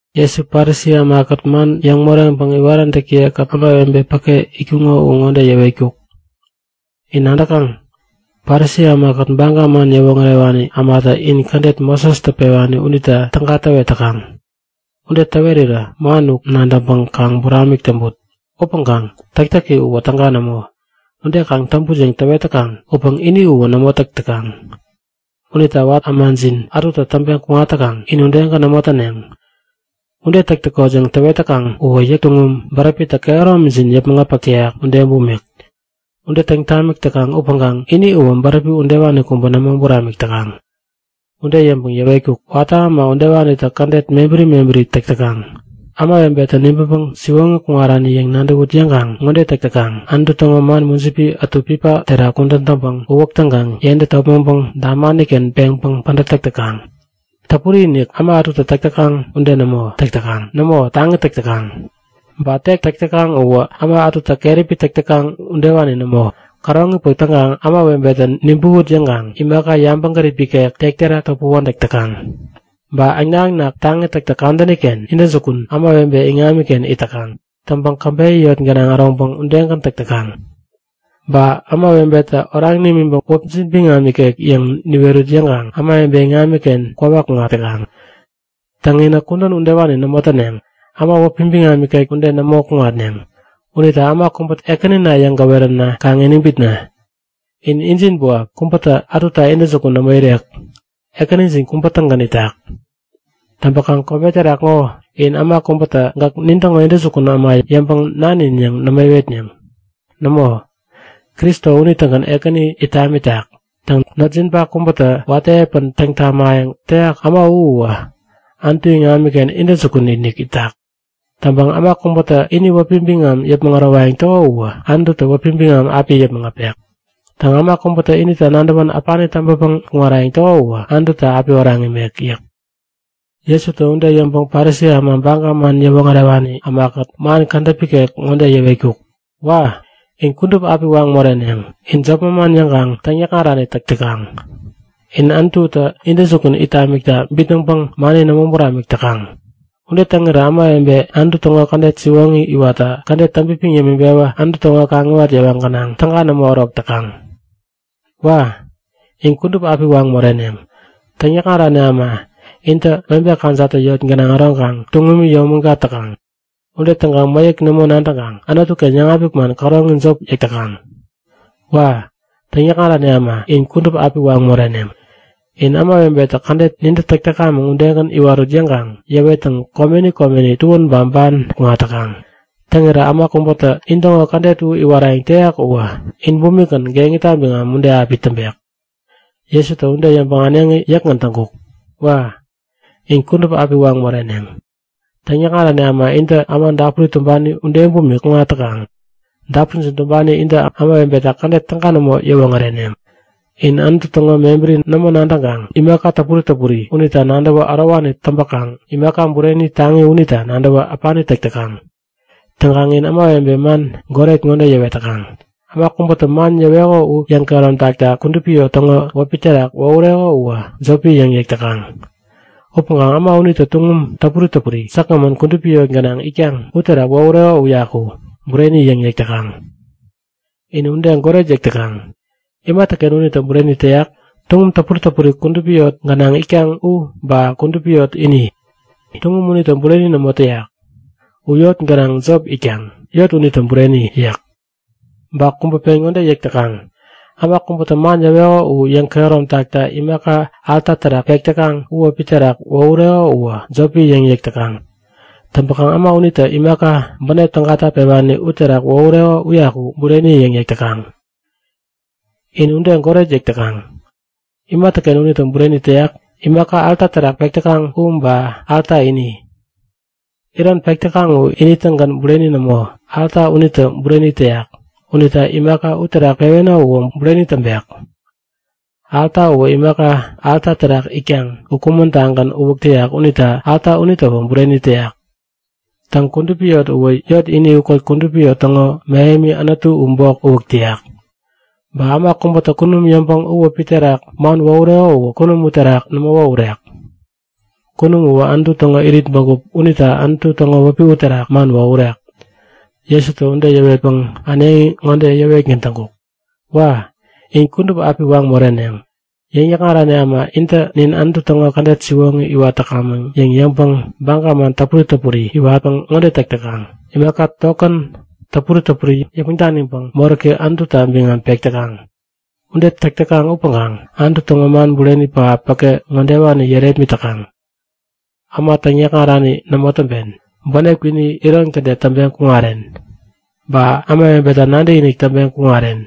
Jesu Parisi ämakät man yäŋ moreŋpäŋ iwaräntäkiye-kät ämawebe päke itkuŋo u ŋode yäwetkuk; In nadäkaŋ? Parisi ämakät Baga man yäwoŋärewani ämatä in kädet Mosestä pewani unita täga täwet täkaŋ. Ude täwerirä man u nadäŋpäŋ kaŋ buramik täŋput. Upäŋkaŋ täktäki uwä täga nämo. Ude kaŋ täŋput yäŋ täwet täkaŋ upäŋkaŋ ini uwä nämo täk täkaŋ. Unita watä ämajin ätutä täŋpeŋ kuŋat täkaŋ in udegän nämo täneŋ. Ude täk täkot yäŋ täwet täkaŋ uwä yäk tuŋum bäräpitä kehäromijin yäpmäŋ äpäk täyak ude bumik. Ude täŋ tamik täkaŋ upäŋkaŋ ini uwä bäräpi udewani kubä nämo buramik täkaŋ. Ude yäŋpäŋ yäwetkuk; Watä äma udewanitä kädet mebäri mebäri täk täkaŋ. Ämawebetä nibäŋpäŋ siwoŋi kuŋarani yäŋ nadäwut yäŋkaŋ ŋode täk täkaŋ; Anutu täŋo man mujipi ätu pipa terak kudän täŋpäŋ uwäk täŋkaŋ yentä topmäŋpäŋ damani-ken peŋpäŋ pädät täk täkaŋ. Täpuri-inik, äma ätutä täk täkaŋ ude nämo täk täkaŋ. Nämo, taŋi täk täkaŋ! Ba tek täk täkaŋ uwä, äma ätutä keräpi täk täkaŋ udewani nämo. Käroŋipäŋ täŋkaŋ ämawebetä nibäwut yäŋkaŋ imaka yabäŋgärip ikek tek terak topä wädäk täkaŋ. Ba äŋnak-äŋnak taŋi täktäk kadäni-ken intäjukun, ämawebe iŋamiken it täkaŋ. Täŋpäŋ käbeyä yot gänaŋ äroŋpäŋ udegän täk täkaŋ. Ba ämawebetä oraŋ nimiŋpäŋ wäpjin biŋam ikek yäŋ niwerut yäŋkaŋ ämawebe iŋamiken kwawak kuŋat täkaŋ. Täŋ, inä kudän udewani nämo täneŋ. Äma wäpi biŋam ikek ude nämo kuŋatneŋ. Unita äma kubätä Ekänina yäŋ gäweränä kaŋ iniŋ bitnä. In injin buap. Kubätä ätuta intäjukun nämo irek. Ekänijin kubä-tägän itak. Täŋpäkaŋ kome terak ŋo in äma kubäta gäk nintäŋo intäjukun äma yäŋpäŋ Nanin yäŋ nämo iwetneŋ. Nämo, Kristo unitägän Ekäni it tamitak. Täŋ, notjinpak kubätä watä epän täŋ tamayäŋ täyak, äma u uwä Anutu iŋamiken intäjukun-inik itak. Täŋpäŋ äma kubätä ini wäpi biŋam yäpmäŋ ärowayäŋ täko uwä Anututä wäpi biŋam api yäpmäŋ äpek. Täŋ, äma kubätä inita nadäwän äpani täŋpänpäŋ kuŋarayäŋ täko uwä Anututä api oraŋ imek yäk. Jesutä ude yäŋpäŋ Parisi äma Baga man yäwoŋärewani ämakät man kädäp ikek ŋode yäwetkuk; Wa! In kudup api waŋ moreneŋ! In jopman yäŋkaŋ täŋyäkŋarani täk täkaŋ. In Anututä intäjukun it tamikta bitnäŋpäŋ mani nämo buramik täkaŋ. Ude täŋirä ämawebe Anutu täŋo kädet siwoŋi iwatta kädet täŋpipiŋ yämiŋpewä Anutu täŋo kaŋiwat yewa gänaŋ täga nämo ärok täkaŋ. [ Wa! In kudup api waŋ moreneŋ! Täŋyäkŋarani äma intä webe kajattä yot gänaŋ äroŋkaŋ tuŋumi yäyomägat täkaŋ. Ude täŋkaŋ mäyäk nämo nadäŋkaŋ Anutu-ken yäŋapik man käroŋi jop yäk täkaŋ.] Wa! Täŋyäkŋarani äma in kudup api waŋ moreneŋ! In ämawebetä kädet nintä täk täkamäŋ ugän iwarut yäŋkaŋ yäwettäŋ komeni komeni tuän ba ban kuŋat täkaŋ. Täŋirä äma kubätä intäŋo kädet u iwarayäŋ täyak uwä in bumikgän geŋita biŋam ude api täŋpek. Jesutä ude yäŋpäŋ äneŋi yäkgän täŋkuk; Wa! In kudup api waŋ moreneŋ! Täŋyäkŋarani äma intä äma dapuri tumbani ude bumik kuŋat täkaŋ. Dapunjin tumbani intä ämawebeta kädet täga nämo yäwoŋäreneŋ. In Anutu täŋo mebärini nämo nadäŋkaŋ imaka täpuri täpuri unita nadäwä ärowani täŋpäkaŋ imaka bureni taŋi unita nadäwä äpani täk täkaŋ. Täŋkaŋ in ämawebe man goret ŋode yäwet täkaŋ; Äma kubätä man yäweko u yäŋkehärom takta kudupi yot täŋo wäpi terak wohureko uwä jopi yäŋ yäk täkaŋ. Upäŋkaŋ äma unitä tuŋum täpuri täpuri säkgämän kudupi yot gänaŋ itkaŋ uterak wohureko uyaku, bureni yäŋ yäk täkaŋ. In ude goret yäk täkaŋ! Imatäken unitä bureni täyak? Tuŋum täpuri täpuri kudupi yot gänaŋ itkaŋ u, ba kudupi yot ini? Tuŋum unitä bureni nämo täyak. U yot gänaŋ jop itkaŋ yot unitä bureni! yäk. Ba kubä pen ŋode yäk täkaŋ; Äma kubätä man yäweko u yäŋkehärom takta, imaka alta terak pek täkaŋ u wäpi terak wohureko uwä jopi yäŋ yäk täkaŋ. Täŋpäkaŋ äma unitä imaka bänep tägata pewani uterak wohureko uyaku bureni yäŋ yäk täkaŋ. In ude goret yäk täkaŋ. Imatäken unitä bureni täyak? Imaka alta terak pek täkaŋ u, ba alta ini? Iron pek täkaŋ u ini-tägän bureni nämo. Alta unitä bureni täyak unita imaka uterak peweno uwä bureni täŋpek. Alta uwä imaka alta terak itkaŋ u kumän-tagän uwäk täyak unita alta unitäwä bureni täyak. Täŋ, kudupi yot uwä yot ini ukät kudupi yot täŋo mähemi Anutu u bok uwäk täyak. Ba äma kubätä kunum yäŋpäŋ u wäpi terak man wohureko uwä kunum uterak nämo wohurek. Kunum uwä Anutu täŋo irit bägup unita Anutu täŋo wäpi uterak man wohurek. Jesutä ude yäwetpäŋ äneŋi ŋode yäwetgän täŋkuk; Wa! In kudup api waŋ moreneŋ! Täŋyäkŋarani äma intä Nin Anutu täŋo kädet siwoŋi iwat täkamäŋ yäŋ yäŋpäŋ baga man täpuri täpuri iwatpäŋ ŋode täk täkaŋ; Imaka tokän täpuri täpuri yäpmäŋ daniŋpäŋ moräki Anututa biŋam pek täkaŋ. Ude täk täkaŋ upäŋkaŋ Anutu täŋo man bureni pähap päke ŋodewani yärepmit täkaŋ; Äma täŋyäkŋarani nämo täŋpen. Bänep kwini iron kädet täŋpeŋ kuŋaren. Ba, ämawebeta nadäkinik täŋpeŋ kuŋaren.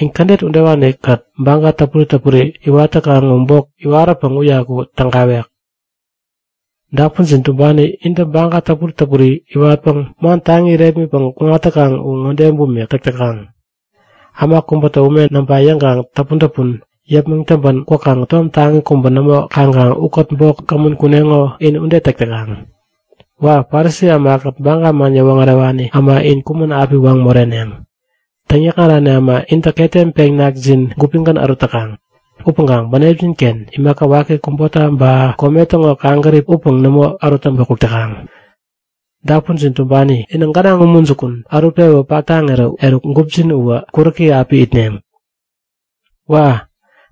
In kädet udewani-kät baga täpuri täpuri iwat täkaŋ u bok iwaräpäŋ uyaku tägawek. Dapunjin tumbani intä baga täpuri täpuri iwatpäŋ man taŋi irepmitpeŋ kuŋat täkaŋ u ŋode bumik täk täkaŋ; Äma kubätä ume näŋpa yäŋkaŋ täpun-täpun yäpmäŋ täŋpän kwäpäŋ tom taŋi kubä nämo kaŋkaŋ ukät bok kämän kuneŋo in ude täk täkaŋ. Wa! Parisi ämakät Baga man yäwoŋärewani äma in kumän api waŋ moreneŋ. Täŋyäkŋarani äma intä ketem peŋ-nakjin gupigän ärut täkaŋ upäŋkaŋ bänepjin-ken imaka waki kubota ba kome täŋo kaŋgärip upäŋ nämo ärut täŋpä kuk täkaŋ. Dapunjin tumbani! Inä gänaŋ umu jukun ärutpewä pak taŋirä eruk gupjin uwä kuräki api itneŋ. Wa!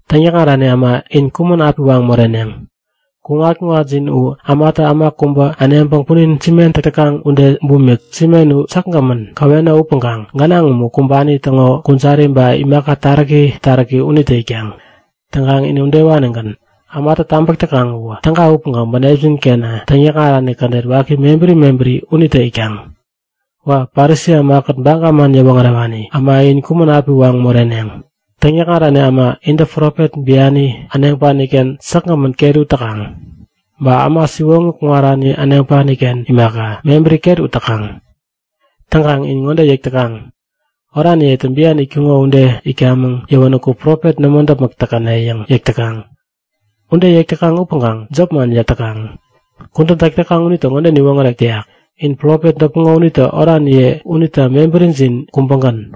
Täŋyäkŋarani äma in kumän api waŋ moreneŋ. Kuŋat-kuŋatjin u ämatä äma kubä äneŋpäŋ punin simen täk täkaŋ ude bumik. Simen u säkgämän käweno upäŋkaŋ gänaŋ umu kumbani täŋo kujari ba imaka taräki taräki unitä itkaŋ. Täŋkaŋ in udewanigän. Ämatä tabäk täkaŋ uwä täga upäŋkaŋ bänepjin-kenä täŋyäkŋarani kädet waki mebäri mebäri unitä itkaŋ. Wa! Parisi ämakät Baga man yäwoŋärewani äma in kumän api waŋ moreneŋ. Täŋyäkŋarani äma intä profet biani äneŋpani-ken säkgämän ket ut täkaŋ. Ba äma siwoŋi kuŋarani äneŋpani-ken imaka, mebäri ket ut täkaŋ. Täŋkaŋ in ŋode yäk täkaŋ; Oraniyetä bian itkuŋo ude itkamäŋ yäwänäku profet nämo däpmäk täkäne yäŋ yäk täkaŋ. Ude yäk täkaŋ upäŋkaŋ jopman yäk täkaŋ. Kudän täk täkaŋ unitä ŋode niwoŋärek täyak; In profet däpuŋo unitäŋo oraniye unita mebärijin kubägän.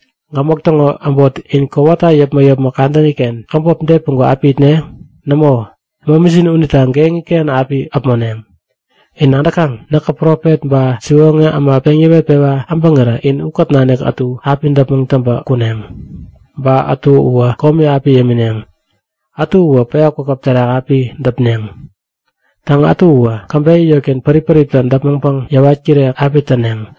Gämok täŋo äbot in kowata yäpmäk-yäpmäk kadäni-ken käbop de päŋku api itneŋ? Nämo! Momijin unita geŋi-ken api äpmoneŋ. In nadäkaŋ? Näkä profet ba siwoŋi äma peŋ yäwetpewa äbäŋirä in ukät nanik ätu api däpmäŋ täŋpä kuneŋ. Ba ätu uwä komi api yämineŋ. Ätu uwä päya kwakäp terak api däpneŋ. Täŋ ätu uwä käbeyä yotken pärip-päriptä däpmäŋpäŋ yäwat kirek api täneŋ.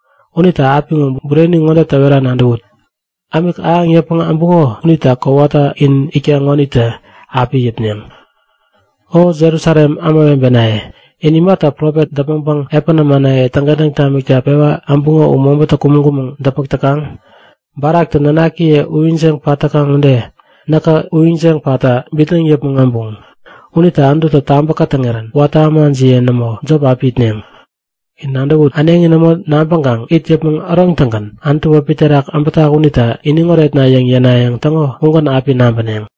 Unita apiŋo bureni ŋode täwera nadäwut; Ämik ahäŋ yäpmäŋ äbuŋo unita kowata in itkaŋ ŋonitä api yäpneŋ. O Jerusalem ämawebenaye! In imata profet däpmäŋpäŋ epän ämanaye täŋkentäŋ tamikta pewa äbuŋo u mobätä kumäŋ-kumäŋ däpmäk täkaŋ? Baraktä nanakiye uyiŋjeŋ pat täkaŋ ude näkä in uyiŋjeŋ patta bitnäŋ yäpmäŋ äbuŋ. Unita Anututä tabä kätäŋirän watä ämajiye nämo, jop api itneŋ. In nadäwut! Äneŋi nämo nabäŋkaŋ it yäpmäŋ äroŋtäŋgän Anutu wäpi terak abätak unita iniŋ oretna yäŋ yänayäŋ täŋo ugän api nabäneŋ.